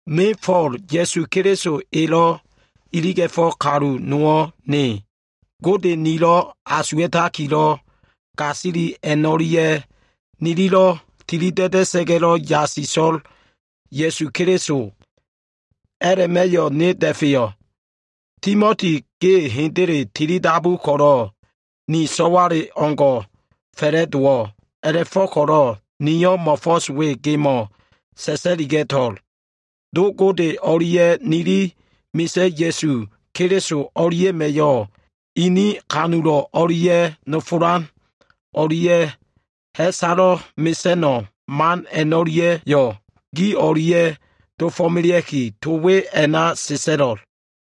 Ne Fo꞉l, Ya꞉su Keliso elo꞉ iliga꞉felo꞉ kalu nowo꞉ ne. Gode nilo꞉ asuwa꞉takilo꞉ gasili a꞉no꞉lia꞉, nililo꞉ tilida꞉da꞉sa꞉ga꞉lo꞉ yasiso꞉l Ya꞉su Keliso, a꞉la꞉ma꞉yo꞉ ne da꞉feyo꞉. Timoti, ge hendele tilidabu ko꞉lo꞉ ni so꞉wale o꞉ngo꞉ fa꞉la꞉dowo꞉. A꞉la꞉fo꞉ko꞉lo꞉ niyo꞉ mo꞉fo꞉s we gemo꞉ sa꞉sa꞉liga꞉to꞉l. Do Gode o꞉lia꞉ nili Misa꞉ Ya꞉su Keliso o꞉lia꞉ma꞉yo꞉ ini kanulo꞉ o꞉lia꞉ nofolan o꞉lia꞉ ha꞉salo꞉ mesa꞉no꞉ man a꞉no꞉lia꞉yo꞉ gi o꞉lia꞉ dofo꞉melea꞉ki, to we a꞉na sa꞉sa꞉lo꞉l.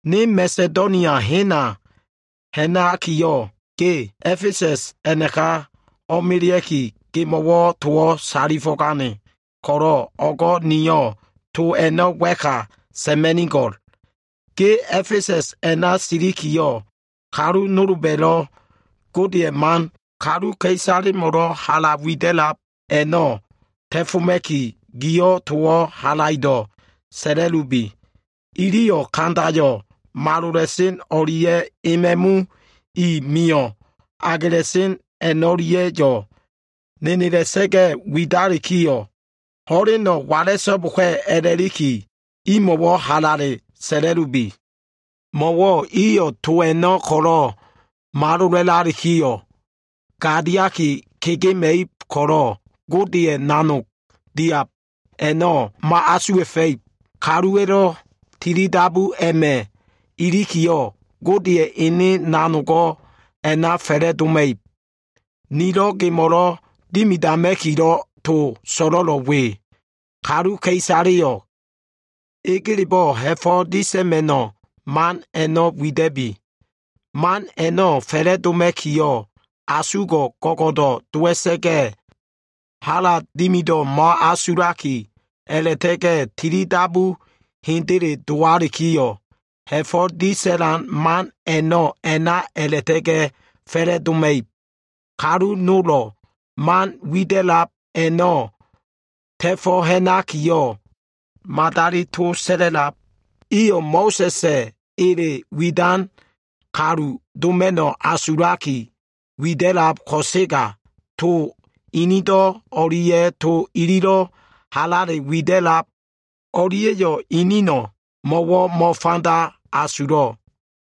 Ne Masedonia hena ha꞉nakiyo꞉, ge A꞉fesa꞉s a꞉naka o꞉melea꞉ki, gemo꞉wo꞉ towo꞉ salifo꞉gane ko꞉lo꞉ o꞉go꞉ niyo꞉ to a꞉no꞉ wa꞉ka sa꞉ma꞉nigo꞉l. Ge A꞉fesa꞉s a꞉na silikiyo꞉, kalu nolba꞉lo꞉ Godeya꞉ man kaluka꞉isalemo꞉lo꞉ hala wida꞉lab a꞉no꞉ ta꞉foma꞉ki, giyo꞉ towo꞉ halaido꞉ sa꞉la꞉lubi. Iliyo꞉ kandayo꞉ malola꞉sen o꞉lia꞉ e ma꞉mu i mio꞉ agela꞉sen a꞉no꞉lia꞉yo꞉ nenela꞉sa꞉ga꞉ widalikiyo꞉, ho꞉leno꞉ wala꞉so꞉boka꞉ a꞉la꞉liki, imo꞉wo꞉ halale sa꞉la꞉lubi. Mo꞉wo꞉ iyo꞉ to a꞉no꞉ ko꞉lo꞉ malola꞉lalikiyo꞉, gadiaki kega꞉mela꞉ib ko꞉lo꞉, Godeya꞉ nanog diab a꞉no꞉ mo꞉asuwa꞉fa꞉ib. Kaluwa꞉lo꞉ tilidabu a꞉ma꞉ ilikiyo꞉, Godeya꞉ ene nanogo꞉ a꞉na fa꞉la꞉doma꞉ib. Nilo꞉ gemo꞉lo꞉ dimidama꞉kilo꞉ to so꞉lo꞉lo꞉ we. Kaluka꞉isaleyo꞉ egelebo꞉ ha꞉fo꞉ disa꞉ma꞉no꞉ man a꞉no꞉ wida꞉bi. Man a꞉no꞉ fa꞉la꞉doma꞉kiyo꞉, asulo꞉wo꞉ go꞉go꞉do꞉ dowa꞉sa꞉ga꞉, hala dimido꞉wo꞉ mo꞉asulaki, a꞉la꞉ta꞉ga꞉ tilidabu hendele dowalikiyo꞉, ha꞉fo꞉ disa꞉lan man a꞉no꞉, a꞉na a꞉la꞉ta꞉ga꞉ fa꞉la꞉doma꞉ib. Kalu nolo꞉ man wida꞉lab a꞉no꞉ ta꞉fo꞉ ha꞉nakiyo꞉, madali to sa꞉la꞉lab. Iyo꞉ Mo꞉sa꞉sa꞉ elelo꞉ widan kalu doma꞉no꞉ asulaki wida꞉lab ko꞉sega, to inido꞉ o꞉lia꞉ to ililo꞉ halale widab o꞉lia꞉yo꞉ inino꞉lo꞉ mo꞉wo꞉ mo꞉fanda asulo꞉.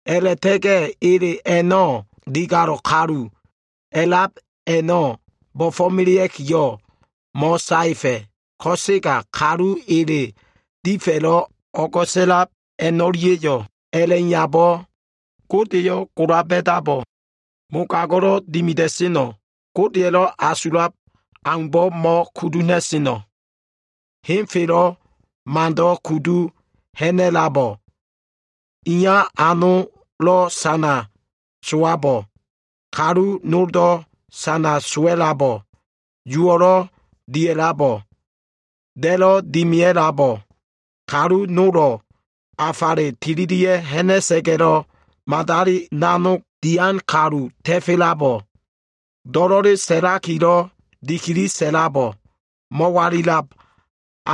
A꞉la꞉ta꞉ga꞉ ele a꞉no꞉, digalo꞉ kalu a꞉lab a꞉no꞉ bo꞉fo꞉melea꞉kiyo꞉, mo꞉saefa꞉. Ko꞉sega ele difa꞉lo꞉ o꞉go꞉sa꞉lab kalu a꞉no꞉lia꞉yo꞉, a꞉la꞉iyabo꞉, Godeyo꞉ gola ba꞉dabo꞉, mogago꞉lo꞉ dimida꞉seno꞉, Godeya꞉lo꞉ asulab aumbo꞉ mo꞉kudu ha꞉na꞉sen a꞉no꞉, henfelo꞉ mando꞉ kudu ha꞉na꞉labo꞉, ene iya anolo꞉ sana sowabo꞉, kalu noldo꞉ sana sowa꞉labo꞉, uwo꞉lo꞉ dia꞉labo꞉, da꞉lo꞉ dimia꞉labo꞉, kalu nolo꞉ afale tilili ha꞉na꞉sa꞉ga꞉lo꞉ madali nanog dian kalu ta꞉felabo꞉, do꞉lo꞉le sa꞉lakilo꞉ dikili sa꞉labo꞉, mo꞉walilab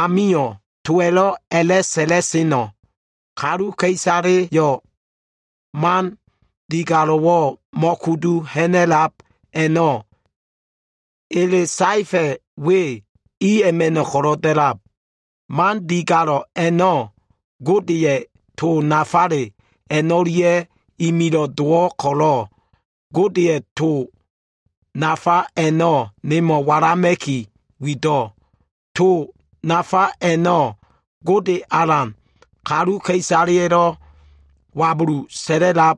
amio꞉ towa꞉lo꞉ a꞉la꞉sa꞉lano꞉, kaluka꞉isaleyo꞉ man digalo꞉wo꞉ mo꞉kudu ha꞉na꞉lab a꞉no꞉, ele saefa꞉ we i a꞉ma꞉no꞉ ko꞉lo꞉ da꞉lab. Man digalo꞉ a꞉no꞉, Godeya꞉ to nafale a꞉no꞉lia꞉yo꞉ imilo꞉ dowo꞉ ko꞉lo꞉, Godeya꞉ to nafa a꞉no꞉ nemo꞉ walama꞉ki wido꞉. To nafa a꞉no꞉, kaluka꞉isaleya꞉lo꞉ Gode Alan ko꞉lo꞉ wabulu sa꞉la꞉lab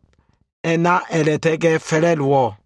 a꞉na a꞉la꞉ta꞉ga꞉ fa꞉la꞉dowo꞉.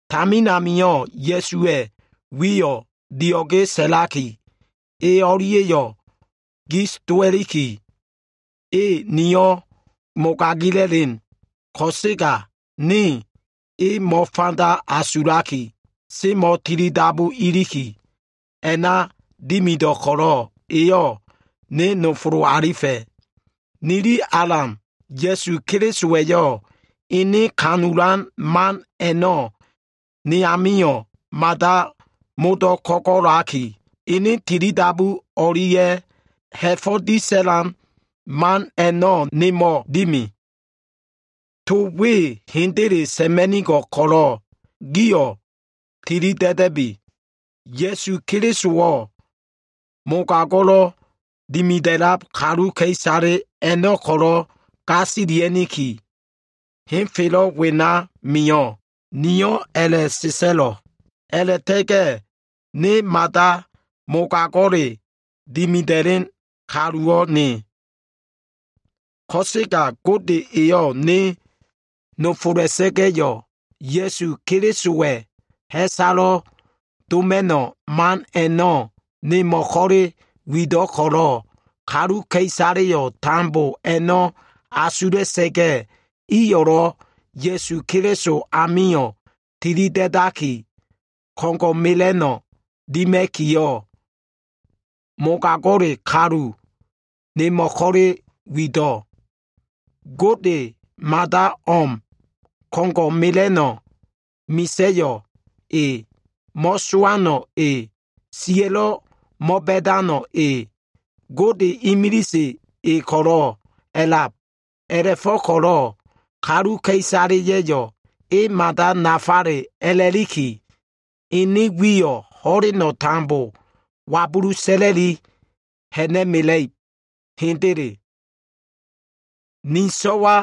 Tamin amio꞉ Ya꞉suwa꞉ wiyo꞉ dio꞉ge sa꞉laki, e o꞉lia꞉yo꞉ gis dowa꞉liki, e niyo꞉ mogagila꞉len. Ko꞉sega ne e mo꞉fanda asulaki mo꞉ tilidabu iliki, a꞉na dimido꞉ ko꞉lo꞉ eyo꞉ ne nofolo꞉ alifa꞉. Nili Alan Ya꞉su Kelisowa꞉yo꞉, ene kanulan man a꞉no꞉ ne amio꞉ mada modo꞉ ko꞉go꞉laki, ene tilidabu o꞉lia꞉ ha꞉fo꞉ disa꞉lan man a꞉no꞉ nemo꞉ dimi. To we hendele sa꞉ma꞉nigo꞉l ko꞉lo꞉ gio꞉ tilida꞉da꞉bi. “Ya꞉su Kelisowo꞉ mogago꞉lo꞉ dimida꞉lab kaluka꞉isale a꞉no꞉ ko꞉lo꞉ gasilia꞉niki, henfelo꞉ wena mio꞉,” niyo꞉ a꞉la꞉sa꞉sa꞉lo꞉l. A꞉la꞉ta꞉ga꞉ ne mada mogago꞉lelo꞉ dimida꞉len kaluwo꞉ ne. Ko꞉sega Gode eyo꞉ ne nofola꞉sa꞉ga꞉yo꞉, Ya꞉su Kelisowa꞉yo꞉ ha꞉salo꞉ doma꞉no꞉ man a꞉no꞉ nemo꞉ ko꞉le wido꞉ ko꞉lo꞉, kaluka꞉isaleyo꞉ tambo a꞉no꞉ asula꞉sa꞉ga꞉, iyo꞉lo꞉ Ya꞉su Keliso amio꞉ tilida꞉daki, ko꞉ngo꞉ mela꞉no꞉ dima꞉kiyo꞉, mogago꞉le kalu nemo꞉ ko꞉le wido꞉. Gode mada o꞉m, Ko꞉ngo꞉ mela꞉no꞉ misa꞉yo꞉ E. Mo꞉sowano꞉ E. Siya꞉lo꞉ mo꞉ba꞉dano꞉ E. Godeyo꞉ imilise E ko꞉lo꞉ a꞉lab. A꞉la꞉fo꞉ko꞉lo꞉ kaluka꞉isaleya꞉yo꞉ E mada nafale a꞉la꞉liki, Ene wiyo꞉ ho꞉leno꞉ tambo wabulu sa꞉la꞉i ha꞉na꞉mela꞉ib. Hendele. Ni so꞉wa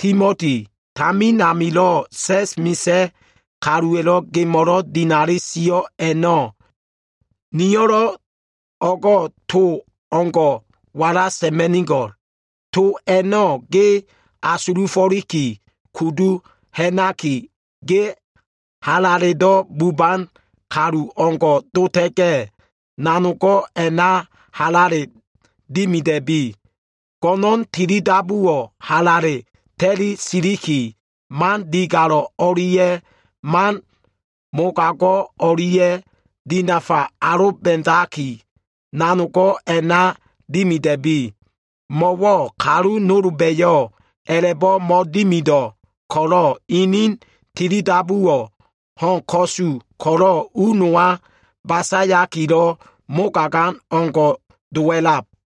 Timoti, tamin amilo꞉ sa꞉s misa꞉ kaluwa꞉lo꞉ gemo꞉lo꞉ dinali sio꞉ a꞉no꞉, niyo꞉lo꞉ o꞉go꞉ to o꞉ngo꞉ ko꞉ wala sa꞉ma꞉nigo꞉l. To a꞉no꞉ ge asulufo꞉liki kudu ha꞉naki, ge halaledo꞉ buban kaluwo꞉ o꞉ngo꞉ dota꞉ga꞉, nanogo꞉ a꞉na halale dimida꞉bi. Go꞉no꞉n tilidabuwo꞉ halale ta꞉li siliki, man digalo꞉ o꞉lia꞉ man mogago꞉ o꞉lia꞉yo꞉ dinafa aloba꞉daki, nanogo꞉ a꞉na dimida꞉bi. Mo꞉wo꞉ kalu nolba꞉yo꞉ a꞉la꞉bo꞉ mo꞉dimido꞉ ko꞉lo꞉, inin tilidabuwo꞉ ho꞉n ko꞉su ko꞉lo꞉ u nowa basayakilo꞉ mogagan o꞉ngo꞉ dowa꞉lab.